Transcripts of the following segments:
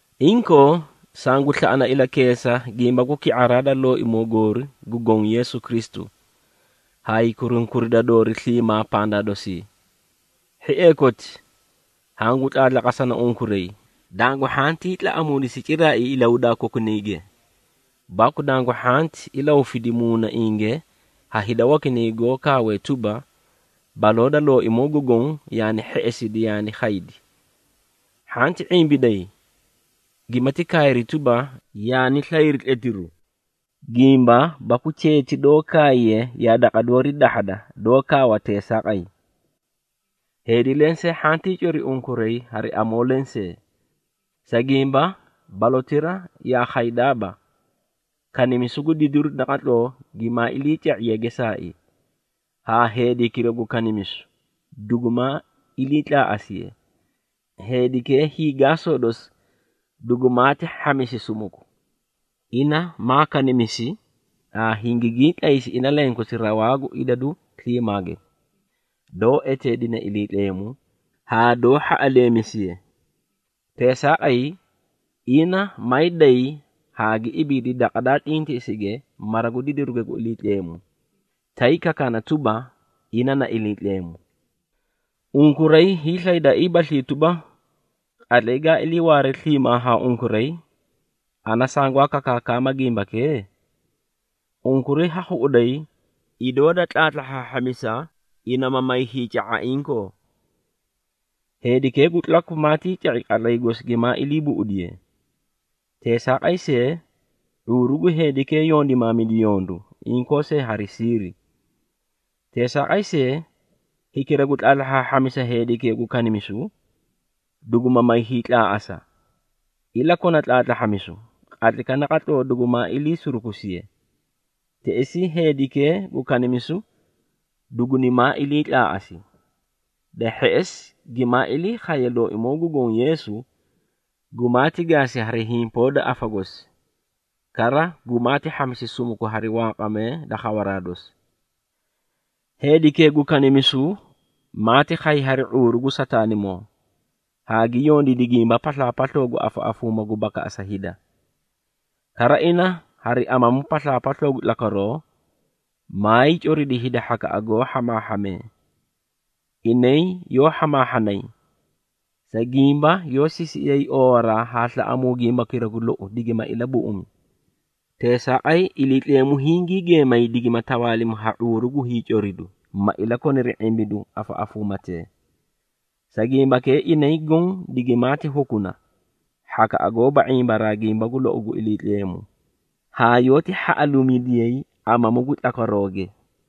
Inkoo, sangu slaꞌana ilakeesa gimba gu ki⁄araa da Looimoo goori gu Goõ Yeesu Kristu, haay kurunkurida doori sliimaa pandaa dosii. Hhiee koti, hangu tlaatlaqasana unkuray, dangu hhantii tlaꞌamuudisi ciraai ilahudaa kokunayge, baku dangu hhanti ilahufidi muunainge ha hida wakinay goó kaawee tuba, baloo da Looimoo gu Goõ yaani hheꞌesidi yaani khaydi. Hhanti ⁄imbiday, gimati kaayri tuba, yaani slayri tletiru, gimba baku cheeti doó kaayiye yaa daqa doori dahhada, doó kaawa teesaaqay. Heedi lensee hhantii cori unkuray hari amoo lensee. Sa gimba, balotira yaa khaydaaba, kanimisu gu didiru naqatloo gimaa iliica⁄iye gesaai, haa heedikira gu kanimisu dugumaa iliitlaaꞌasiye. Heedikee hiigaasoo dosi dugumaati hhamisi sumuku. Ina maa kanimisi haa hingigii tlaysi ina lenkosi rawaa gu idadu sliimaage, doó eteedinee Iliitleemu, haa doó hhaꞌaleemisiye. Teesaaqay, ina maay day haa gi ibiidi daqa daa tlintiꞌisige mara gu didiruge gu Iliitleemu, tay kakaana tuba, ina na Iliitleemu. Unkuray hiislaydaaiibaslii tuba, qatlay gaa iliiwaare sliimaa haa unkuray, ana sangwaa kakaakama gimbakee? Unkuray ha khuꞌuday idoo da tlahhaahhamisa, ina ma may hiica⁄a inkoo. Heedikee gu tlaku maatii ca⁄i qatlay gosi gimaa ilii buꞌudiye. Teesaaqay see, ⁄uuru gu heedikee yondimaamidi yondu, inkoo see hari siiri. Teesaaqay see, hikira gu tlahhaahhamisa heedikee gu kanimisu, duguma may hiitlaaꞌasa, ilakona tlaatlahhamisu, qatlaykaꞌa naqatloo dugumaa ilii surukusiye. Teꞌesii, heedikee gu kanimisu dugunimaa ilii tlaaꞌasi. Da hheꞌesi, gimaa ilii khaye Looimoo gu Goõ Yeesu, gumaati gaasi hari himpoo da afa gosi, kara gumaati hhamisi sumuku hari wanqamee da khawaraa dosi. Heedikee gu kanimisu maati khay hari ⁄uuru gu Sataanimoo, haa gi yondiidi gimba paslaapasloo gu afaꞌafuuma gu bakaꞌasa hida. Kara, ina hari amamu paslaapasloo gu tlakwaroo, maay coridi hida hhakaꞌa goó hhamaahhamee. Inay yoó hhamaahhanay, sa gimba yoó sisiꞌiyay oowaraa haa slaꞌamuu gimbakira gu lou, digima ilabuꞌumi. Teesaaqay, Iliitleemu hingii geemay digima tawaalimi ha ⁄uuru gu hiicoridu, ma ilakoniri ⁄imbiduu afaꞌafuumatee. Sa gimbakee, inay goõ digimaati hukuna, hhakaꞌa goóba ⁄imbaraa gimba gu lou gu Iliitleemu, haa yoóti hhaꞌaluumidiyay amamu gu tlakwarooge.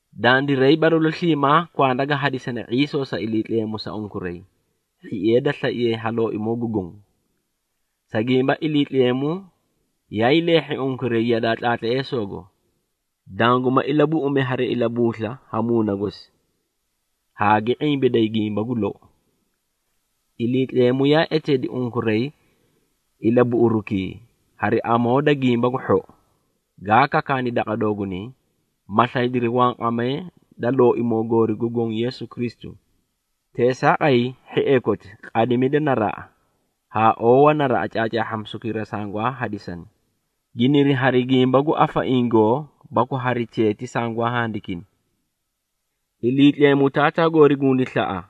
Dandiray, balalu sliimaa kwanda ga hadisane ⁄iisoo sa Iliitleemu sa unkuray, hhiee da slaiye ha Looimoo gu Goõ. Sa gimba, Iliitleemu yaay leehhi unkuray yadaa tlaatleesoogo, danguma ilabuꞌumi hari ilabuusla ha Muuna gosi, haa gi ⁄imbiday gimba gu lou. Iliitleemu yaa eteedi unkuray ilabuꞌurukii, hari amoo da Gimba gu Hhou, gaa kakaani daqa doogunay, ma slaydiri wanqamee da Looimoo goori gu Goõ Yeesu Kristu. Teesaaqay, hhiee koti, qadimida naraꞌa, haa oowa naraꞌa caacaahhamisukira sangwaa hadisani, giniri hari gimba gu afaiĩ goo baku hari cheeti sangwaa handikini. Iliitleemu Taataa goori gundi slaꞌa,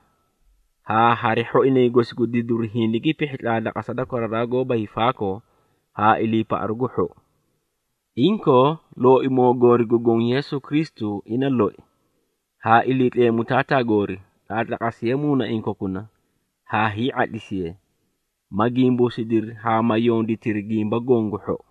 haa hari hhoinay gosi gu didiru hindigi pihhi tlaatlaqasa da koraraa goóba hiifaakoo haa iliipaꞌaru gu hhou. Inkoo, Looimoo goori gu Goõ Yeesu Kristu ina loi, haa Iliitleemu Taataa goori, tlaatlaqasiyee muunaiĩ kokuna haa hii⁄atlisiye, ma gimbuusidiri haa ma yonditiri gimba goõ gu hhou.